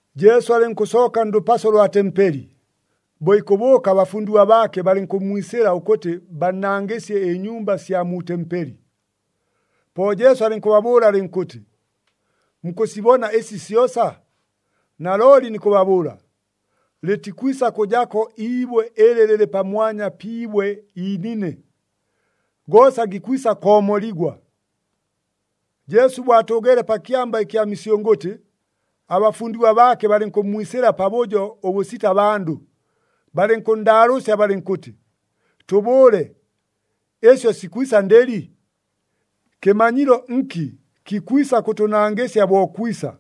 Jesu alɨnkʉsooka ndʉpaso lwa tempeli, bo ikʉbʉʉka abafundigwa baake balɨnkʉmmwisɨla ʉkʉtɨ bannangɨsye ɨnyumba sya mu tempeli. Po Jesu alɨnkʉbabʉʉla alɨnkʉtɨ, “Mukʉsibona ɨsi syosa? Nalooli nikʉbabʉʉla, lɨtikwisa kʉjako iibwe ɨlɨ lɨlɨ pamwanya pi ibwe iinine. Goosa gikwisa koomoligwa!” Jesu bo atʉʉgeele pa Kyamba kya Misyʉngʉtɨ, abafundigwa baake balɨnkʉmmwisɨla pabʉjo ʉbʉsita bandʉ, balɨnkʉnndaalʉʉsya balɨnkʉtɨ, “Tʉbʉʉle, ɨsyo sikwisa ndɨli? Kɨmanyilo nki kikwisa kʉtʉnangɨsya bo kwisa,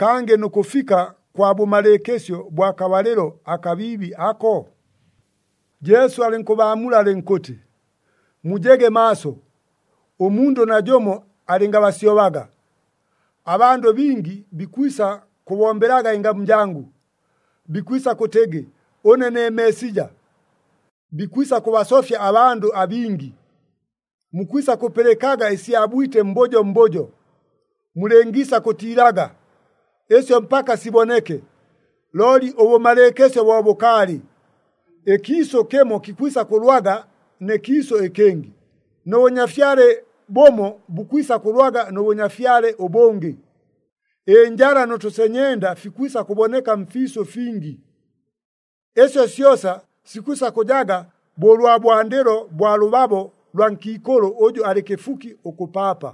kangɨ nʉ kʉfika kwa bʉmalɨɨkɨsyo bwa kabalɨlo akabiibi ako?” Jesu alɨnkʉbaamula alɨnkʉtɨ, “Mujege maaso, ʉmundʉ najʉmo alɨngabasyobaga! Abandʉ bingi bikwisa kʉbombelaga ɨngamu jangʉ, bikwisa kʉtɨgɨ, ‘Ʉne ne Meesija!’ Bikwisa kʉbasofya abandʉ abingi. Mukwisa kʉpɨlɨkaga ɨsya bwite mbʉjo mbʉjo. Mulɨngiisa kʉtiilaga. Ɨsyo mpaka siboneke, looli ʉbʉmalɨɨkɨsyo bo bʉkaalɨ. Ɨkiisʉ kɨmo kikwisa kʉlwaga nɨ kiisʉ ɨkɨngɨ, nʉ bʉnyafyale bʉmo bukwisa kʉlwaga nʉ bʉnyafyale ʉbʉngɨ. Ɨnjala nʉ tʉsenyenda fikwisa kʉboneka mfiisʉ fingi. Ɨsyo syosa sikwisa kʉjaga bo ʉlwa bwandɨlo bwa lʉbabo lwa nkiikʉlʉ ʉjʉ alɨ kɨfuki ʉkʉpaapa.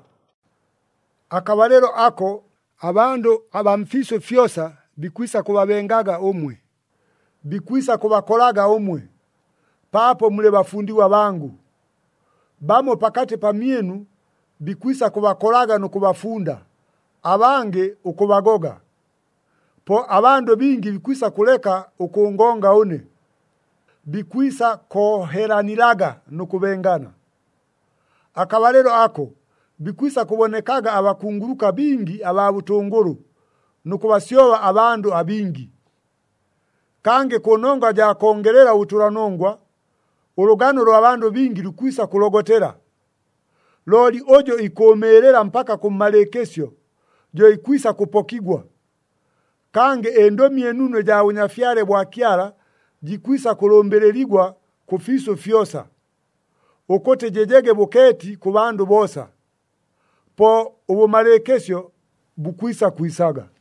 “Akabalɨlo ako, abandʉ abaa mfiisʉ fyosa bikwisa kʉbabengaga ʉmwe, bikwisa kʉbakolaga ʉmwe, paapo mulɨ bafundigwa bangʉ. Bamo pakatɨ pamyɨnu bikwisa kʉbakolaga nʉ kʉbafunda, abangɨ ʉkʉbagoga. Po abandʉ bingi bikwisa kʉleka ʉkʉngonga ʉne. Bikwisa koohelanilaga nʉ kʉbengana. Akabalɨlo ako, bikwisa kʉbonekaga abakunguluka bingi abaa bʉtʉngʉlʉ nʉ kʉbasyoba abandʉ abingi. Kangɨ kʉnongwa jaa kongelela ʉbʉtʉlanongwa, ʉlʉgano ʉlwa bandʉ bingi lukwisa kʉlogotela. Looli ʉjʉ ikʉʉmɨɨlɨla mpaka kʉmmalɨɨkɨsyo, jo ikwisa kʉpokigwa. Kangɨ ɨNdʉmi ɨNunu ɨjaa Bʉnyafyale bwa Kyala jikwisa kʉlʉmbɨlɨligwa kʉfiisʉ fyosa, ʉkʉtɨ jɨjege bʉkeeti kʉ bandʉ boosa. Po ʉbʉmalɨɨkɨsyo bukwisa kwisaga.”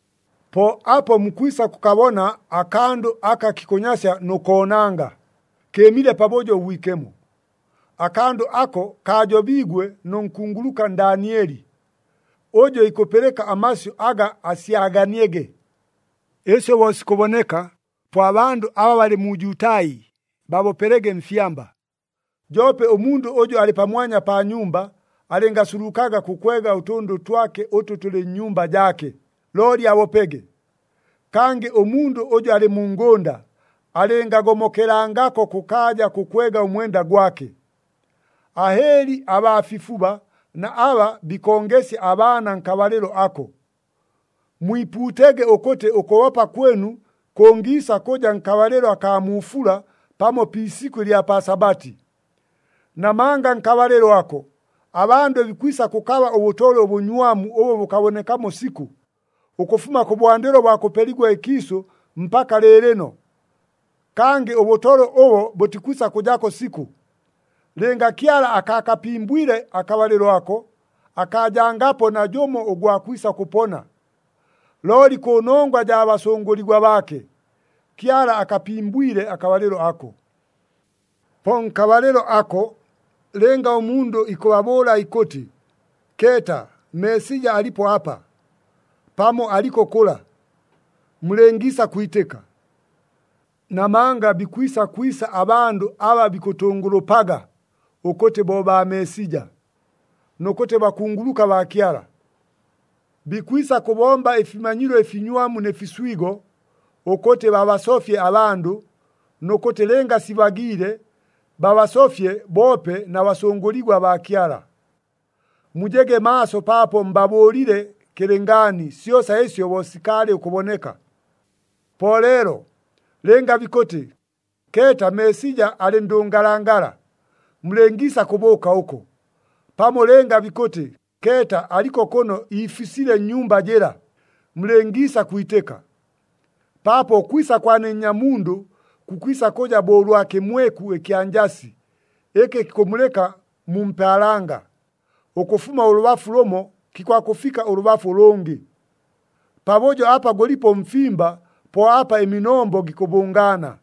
“Po apo mukwisa kʉkabona, ‘Akandʉ aka kikʉnyasya nʉ koonanga,’ kɨɨmile Pabʉjo ʉBwikemo. Akandʉ ako kaajobiigwe nʉ nkunguluka Ndaanieli. Ʉjʉ ikʉpɨlɨka amasyʉ aga asyaganiege. Ɨsyo bo sikʉboneka, po abandʉ aba balɨ mu Jutai, babopelege mfyamba. Joope ʉmundʉ ʉjʉ alɨ pamwanya pa nyumba, alɨngasulukaga kʉkwega ʉtʉndʉ twake ʉtʉ tʉlɨ nnyumba jaake, looli abopege. Kangɨ ʉmundʉ ʉjʉ alɨ mu ngʉnda, alɨngagomokelangako kʉkaaja kʉkwega ʉmwenda gwake. Ahɨɨli abaa fifuba na aba bikongesya abaana nkabalɨlo ako! Mwipuutege ʉkʉtɨ ʉkʉbopa kwɨnu kʉngiisa kʉja nkabalɨlo akaa mu fula pamo pi isikʉ ɨlya pa Sabati. Namanga nkabalɨlo ako, abandʉ bikwisa kʉkaba ʉbʉtolwe ʉbʉnywamu ʉbʉ bʉkabonekamo sikʉ, ʉkʉfuma kʉbwandɨlo bwa kʉpeligwa ɨkiisʉ mpaka lɨɨlɨno. Kangɨ ʉbʉtolwe ʉbo bʉtikwisa kʉjako sikʉ. Lɨnga Kyala akaakapimbwile akabalɨlo ako, akaajangapo najʉmo ʉgwa kwisa kʉpona. Looli kʉnongwa jaa basʉngʉligwa baake, Kyala akapimbwile akabalɨlo ako. “Po nkabalɨlo ako, lɨnga ʉmundʉ ikʉbabʉʉla ikʉtɨ, ‘Keeta, Meesija alipo apa!’ pamo, ‘Aliko kʉla!’ mulɨngiisa kwitɨka. Namanga bikwisa kwisa abandʉ aba bikʉtʉngʉlʉpaga ʉkʉtɨ bo baa Meesija, nʉ kʉtɨ bakunguluka baa Kyala. Bikwisa kʉbomba ɨfimanyilo ɨfinywamu nɨ fiswigo, ʉkʉtɨ babasofye abandʉ, nʉ kʉtɨ lɨnga sibagiile babasofye boope na basʉngʉligwa baa Kyala. Mujege maaso paapo mbabʉʉlile kɨlɨngaani syosa ɨsyo bo sikaalɨ ʉkʉboneka! Po leelo, lɨnga bikʉtɨ, ‘Keeta, Meesija alɨ ndʉngalangala!’ mulɨngiisa kʉbʉʉka ʉko. Pamo lɨnga bikʉtɨ, ‘Keeta, aliko kʉno iifisile nnyumba jɨla!’ mulɨngiisa kwitɨka. Paapo ʉkwisa kwa ne Nnyamundʉ kukwisa kʉja bo ʉlwa kɨmweku ɨkya njasi, ɨkɨ kikʉmulɨka mu mpaalanga, ʉkʉfuma ʉlʉbafu lʉmo kikwakʉfika ʉlʉbafu ʉlʉngɨ. Pabʉjo apa gʉlipo ʉmfimba, po apa ɨminombo gikʉbʉngaana.”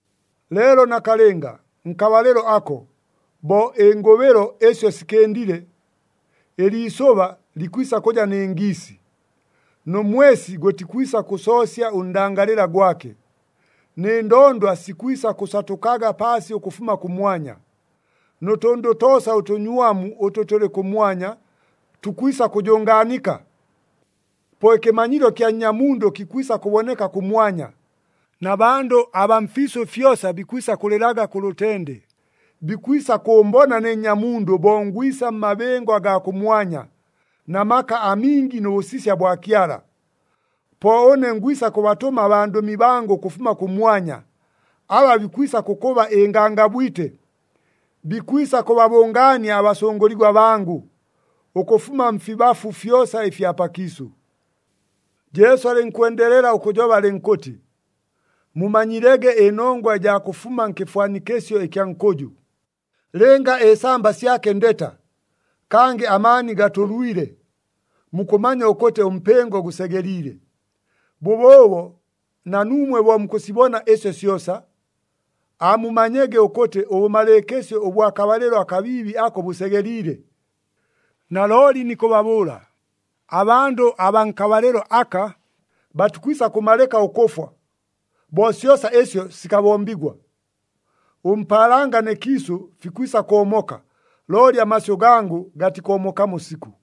“Leelo nakalɨnga, nkabalɨlo ako, bo ɨngʉbɨlo ɨsyo sikɨndile, ‘Ɨliisʉba likwisa kʉja nɨ ngiisi, nʉ mwesi gʉtikwisa kʉsoosya ʉndangalɨla gwake, nɨ ndondwa sikwisa kʉsatʉkaga paasi ʉkʉfuma kʉmwanya. Nʉ tʉndʉ toosa ʉtʉnywamu ʉtʉ tʉlɨ kʉmwanya, tukwisa kʉjʉngaanika.’ “Po ɨkɨmanyilo kya Nnyamundʉ kikwisa kʉboneka kʉmwanya, na bandʉ abaa mfiisʉ fyosa bikwisa kʉlɨlaga kʉ lʉtende, bikwisa kʉʉmbona ne Nnyamundʉ bo ngwisa mmabɨngo agaa kʉmwanya, na maka amingi nʉ bʉsisya bwa Kyala. Po ʉne ngwisa kʉbatʉma abandʉmi bangʉ ʉkʉfuma kʉmwanya, aba bikwisa kʉkʉba ɨngangabwite. Bikwisa kʉbabʉngaania abasʉngʉligwa bangʉ, ʉkʉfuma mfibafu fyosa ɨfya pakiisʉ.” Jesu alɨnkwendelela ʉkʉjoba alɨnkʉtɨ, “Mumanyilege ɨnongwa ɨjaa kʉfuma nkɨfwanikɨsyo ɨkya nkʉjʉ. Lɨnga ɨsamba syake ndeta, kangɨ amaani gatʉlwile, mukʉmanya ʉkʉtɨ ʉmpɨngo gʉsegeliile. Bʉbʉʉbo na nuumwe bo mukʉsibona ɨsyo syosa, aamumanyege ʉkʉtɨ ʉbʉmalɨɨkɨsyo ʉbwa kabalɨlo akabiibi ako bʉsegeliile. Nalooli nikʉbabʉʉla, abandʉ abaa nkabalɨlo aka, batikwisa kʉmalɨka ʉkʉfwa, bo syosa ɨsyo sikabombigwa. Ʉmpaalanga nɨ kiisʉ fikwisa koomoka, looli amasyʉ gangʉ gatikoomokamo sikʉ.”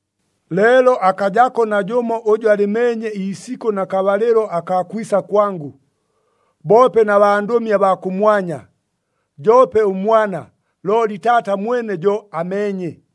“Leelo akajako najʉmo ʉjʉ alɨmeenye iisikʉ na kabalɨlo akaa kwisa kwangʉ, boope na bandʉmi abaa kʉmwanya, joope ʉMwana, looli Taata mwene jo ameenye.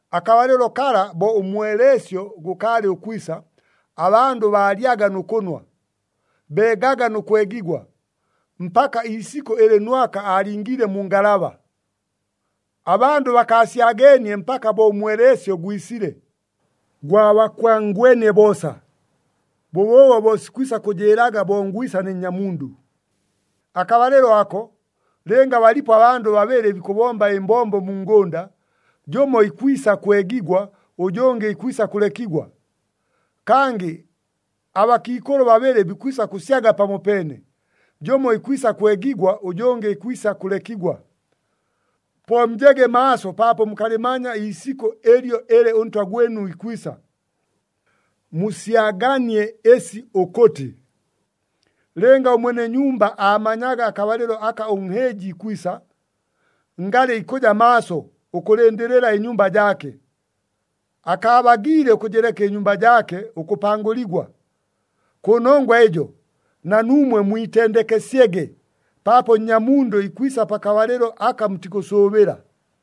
Akabalɨlo kala bo ʉmweleesyo gʉkaalɨ ʉkwisa, abandʉ baalyaga nʉ kʉnwa, beegaga nʉ kwegigwa, mpaka iisikʉ ɨlɨ Nwaka aalingiile mu ngalaba. Abandʉ bakaasyageenie mpaka bo ʉmweleesyo gwisile, gwabakwangwenie boosa. Bʉbʉʉbo bo sikwisa kʉjɨɨlaga bo ngwisa ne Nnyamundʉ. Akabalɨlo ako, lɨnga balipo abandʉ babɨlɨ bikʉbomba ɨmbombo mu ngʉnda, jʉmo ikwisa kwegigwa, ʉjʉngɨ ikwisa kʉlekigwa. Kangɨ abakiikʉlʉ babɨlɨ bikwisa kʉsyaga pamopeene, jʉmo ikwisa kwegigwa, ʉjʉngɨ ikwisa kʉlekigwa. Po mujege maaso paapo mukalɨmanya iisikʉ ɨlyo ɨlɨ ʉNtwa gwɨnu ikwisa. Musyaganie ɨsi ʉkʉtɨ, lɨnga ʉmwene nyumba aamanyaga akabalɨlo aka ʉnhɨɨji ikwisa, ngalɨ ikʉja maaso, ʉkʉlɨndɨlɨla ɨnyumba jaake, akaabagiile ʉkʉjɨleka ɨnyumba jaake ʉkʉpangʉligwa. Kʉnongwa ɨjo, na nuumwe mwitendekesyege, paapo Nnyamundʉ ikwisa pakabalɨlo aka mutikʉsʉʉbɨla.”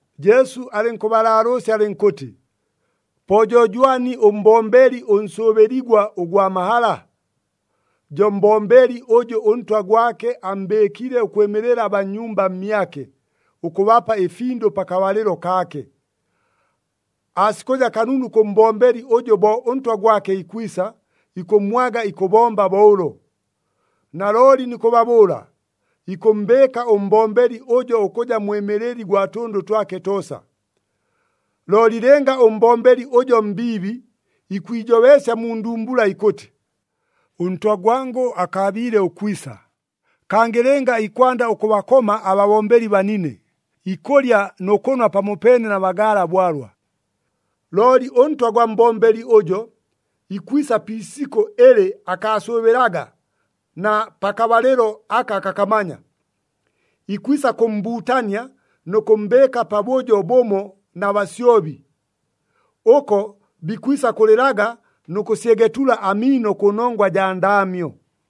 Jesu alɨnkʉbalaalʉʉsya alɨnkʉtɨ, “Po jo jwani ʉmbombeli ʉnsʉʉbɨligwa ʉgwa mahala? Jo mbombeli ʉjʉ ʉntwa gwake ammbɨɨkile ʉkwɨmɨlɨla abaa nnyumba mmyake, ʉkʉbapa ɨfindʉ pakabalɨlo kaake. Aasikʉja kanunu kʉ mbombeli ʉjʉ bo ʉntwa gwake ikwisa, ikʉmmwaga ikʉbomba bo ʉlo. Nalooli nikʉbabʉʉla, ikʉmmbɨɨka ʉmbombeli ʉjo ʉkʉja mwɨmɨlɨli gwa tʉndʉ twake toosa. “Looli lɨnga ʉmbombeli ʉjo mbiibi, ikwijobeesya mu ndumbula ikʉtɨ, ‘Ʉntwa gwangʉ akaabiile ʉkwisa,’ kangɨ lɨnga ikwanda ʉkʉbakoma ababombeli banine, ikʉlya nʉ kʉnwa pamopeene na bagaala bwalwa, ʉntwa gwa mbombeli ʉjo ikwisa pi isikʉ ɨlɨ akaasʉʉbɨlaga na pakabalɨlo aka akakamanya. Ikwisa kʉmmbuutania nʉ kʉmmbɨɨka pabʉjo bʉmo na basyobi. Ʉko bikwisa kʉlɨlaga nʉ kʉsyegetula amiino kʉnongwa jaa ndaamyo.”